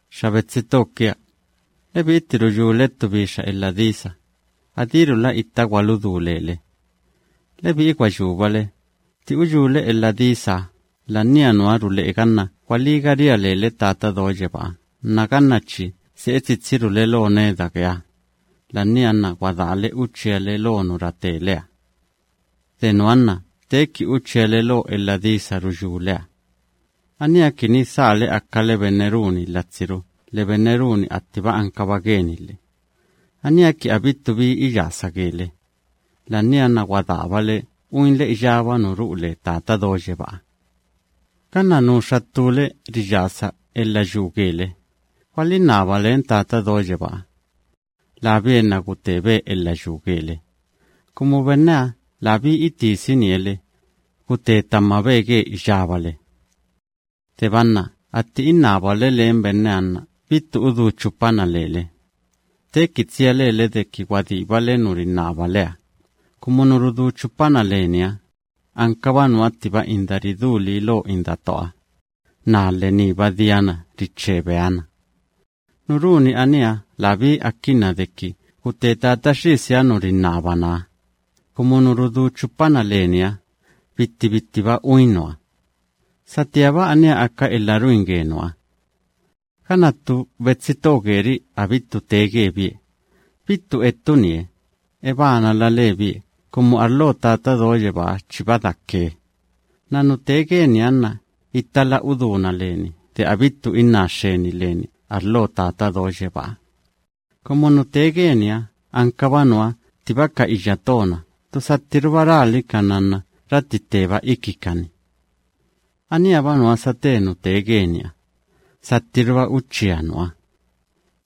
Xa betsi to kia, lebi'i tti ruyúle ttu bixa elha disa, adírula itta gwaludú lele. Lebi'i gwa yúbale, tti uyúle elha disaha, la'ania nuha rule'e ganna gwalíga ria lele Tata Do Yebáha nna ganna chi se'e tsitsirule lo neda geeha, la'ania nna gwadaale uchíale lo nu rateleha. De nuha nna teeki uchíale lo elha disa ruyúleha. Aníha kini dhaale akale benne runi latsiru lhe benne runi taga'a nu anka tse lhe. Aníha kini abittu bi iyasa gele, la'ania nna gwadaabale uinle iyába nu ru'u le Tata Do Yebáha. Ganna nuxa ttúle riyasa elha yuu gele, gwalinnaba len Tata Do Yebáha. Labie nna gutebe elha yuu gele, kumu benneha labí itisinie le, gute tamabe ge iyábale. Deba nna atti innabale len benneha nna bittu udú chupana lele, teeki tsia lele deki gwadíbale nu rinnabaleha, kumu nu rudú chupana leniha, ankaba nuha ttiba inda ridú lii lo indatooha, naa lhe niiba diana riche beha na. Nu runi aníha labí akinna deki gute Tata Xisiha nu rinnabanaha, kumu nu rudú chupana leniha, bitti bittiba uin nuha. Satíaba aníha aka elha ruin ge nuha. Ganna ttu betsi to geri'i abittu tee gebie, bittu ettunie, ebanala lebie kumu arlo Tata Do Yebáha chiba dake, nna nu tee geniha nna ittala udúna leni de elhida gaa Tata Do Yebáha leni. Kumu nu tee geniha ankaba nuha ttiba ka iyya to‑na ttu sattiruba ralikana nna ratti tteba ikikani. Aníha‑ba nuha sate nu tee geniha, sattiruba uchía nuha.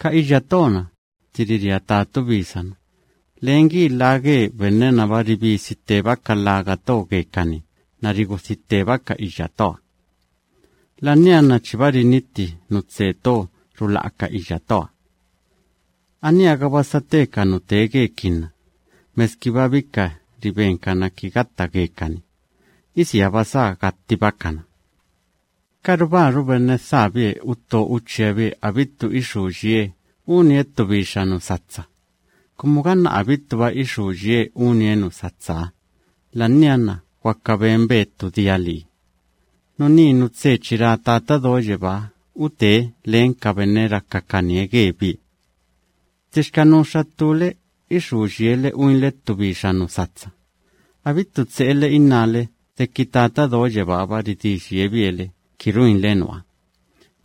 Ka iyya to‑na, tti riria tatubisa‑na, len gi lha ge benne‑naba ribisi tteba ka lhaga to gekani nna rigudhi tteba ka iyya toha. La'ania nna chiba rinitti nu tse to rula'a ka iyya toha. Aníha‑gaba sate ka nu tee gekinna, meskiba bika ribenkana ki gatta gekani, isiaba sá gattibakana. Karubáru benne dhaabie utto uchíabie abittu ixú yiee unie ttu bixa nu satsa, kumu ganna abittuba ixú yiee unie nu satsaha, la'ania nna gwaka benbe ttu dia lii. Nuní nu tse chi ra Tata Do Yebáha utebie len ka benne rakakanie gebie. Ttixka nuxa ttúle ixú yiele uinle ttu bixa nu satsa, abittu tse'ele innále deki Tata Do Yebáha‑ba ridí yiebie le ki ruinle nuha,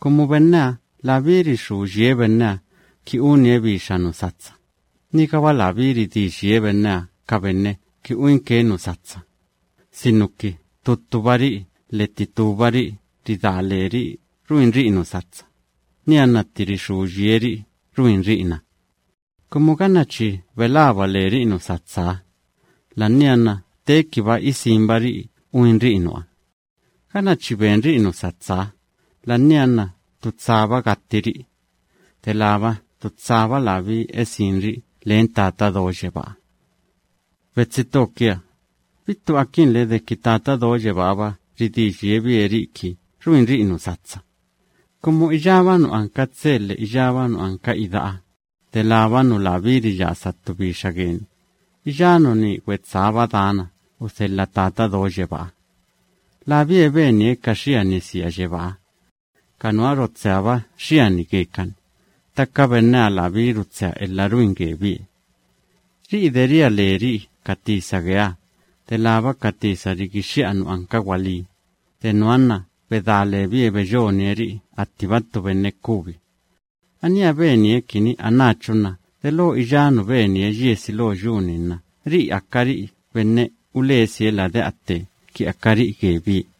kumu benneha labí rixú yie benneha unie ttu bixa nu satsa, nigaba labí ridí yie benneha ka benne ki uinke nu satsa, sinuki ttu ttubari'i lhe titúbari'i ridá leri'i ruinri'i nu satsa, nianna tti rixú yieri'i ruinri'i na. Kumu ganna chi belaba leri'i uinri'i nu satsaha, la'ania nna teekiba isinri'i uinri'i nuha. Ganna chi benri'i nu satsaha, la'ania nna ttu tsaba gattiri'i, delába ttu tsaba labí esinri'i len Tata Do Yebáha. Betsi to kia, bittu akinle deki Tata Do Yebáha‑ba ridí yiebie ri'i ki ruinri'i nu satsa, kumu iyába nu anka tse lhe iyába nu anka ida'a, delába nu labí riyasa ttu bixa geni, iyá nuní gwetsába dana udhelha Tata Do Yebáha. Labie benie ka xiani sia yebáha. Ka nuha rotseaba xiani gekani, ttaka benneha labí rutsea elha ruin gebie. Ri'i de ria leri'i ka tisa geeha, delába ka tisa rigixxi'a nu anka gwalí, de nuha nna bedá lebie beyonie ri'i attiba ttu benne kubi. Aníha benie kini anáchu nna delo iyá nu benie yiesi lo yu‑ni nna ri'i akari'i benne ulesie lade'a tte kini akari'i gebie.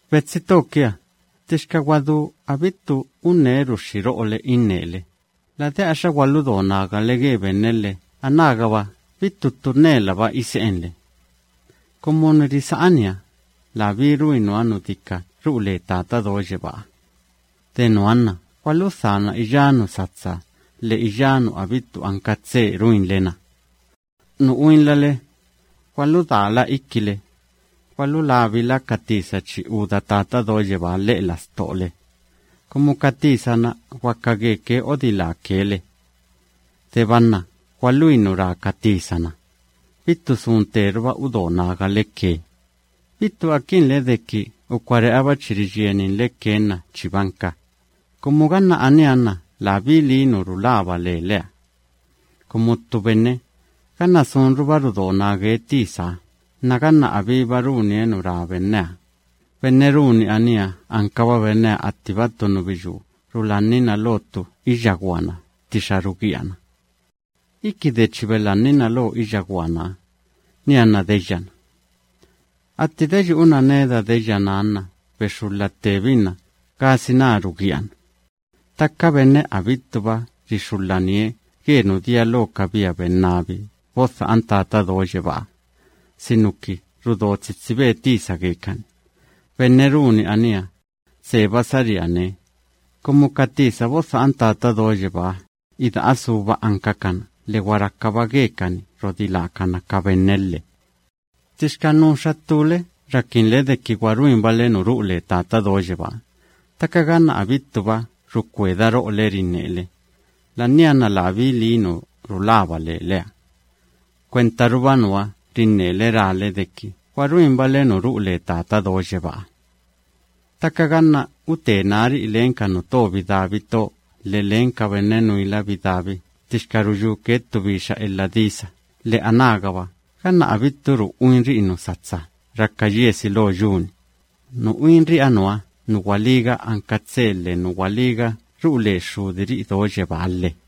Betsi to kia, ttixka gwadú bittu unneruxxi ro'ole innele, lade'axa gwaludo nagale ge benne lhe anágaba bittu ttu nnelaba ise'enle. Kumu nu risa'aniha, labí ruin nuha nu dika ru'u le Tata Do Yebáha. De nuha nna gwaludhana iyá nu satsa lhe iyá nu abittu anka tse ruinle‑na. Nu uinlale, gwaludaala ikile, gwalulabila ka tisa chi úda Tata Do Yebáha lhe'e lastole, kumu ka tisa‑na gwaka geke odiláke le. Deba nna gwaluin nu ra ka tisa‑na, bittu sun tteruba udo nagale ke, bittu akinle deki ukare'aba chi riyieninle ke nna chibanka, kumu ganna aníha nna labí lii nu rulaba leleha. Kumu ttu benne, ganna sunruba rudo nage tisaha nna ganna abíba runie nu ra benneha, benne runi aníha ankaba benneha attiba ttu nubiyú rulaninna lo ttu iyya gwana ttixa rugíana. Iki de chi belannina lo iyya gwanaha, nianna deyyana. Atti deyu'una neda deyyanaha nna bexulha ttebinna gasina rugíana. Ttaka benne abittuba rixulhanie ge nu dia lo ka tisa ge Tata Do Yebáha, sinuki rudo tsitsibe tisa geke, benne runi aníha, tseba saríane, kumu ka tisaha, ida'a suba ankake lhe gwa rakaba geke rodiláke ka benne lhe. Ttixka nuxa ttúle rakinle deki gwa ruinbale nu ru'u le Tata Do Yebáha, ttaka ganna abittuba rukweda ro'ole rinnele, la'ania nna labí lii nu rulaba leleha. Kwentaruba nuha rinnele rale deki gwa ruinbale nu ru'u le Tata Do Yebáha. Ttaka ganna ute nári'i len ka nuto bidabi to lhe len ka benne nuila bidabi ttixka ruyúke ttu bixa elha disa lhe anágaba ganna abitturu uinri'i nu satsa raka yiesi lo yu‑ni, nu uinri'iha nuha nu gwalíga anka tse lhe nu gwalíga ru'u le Xxudiri'i do yebáha lhe.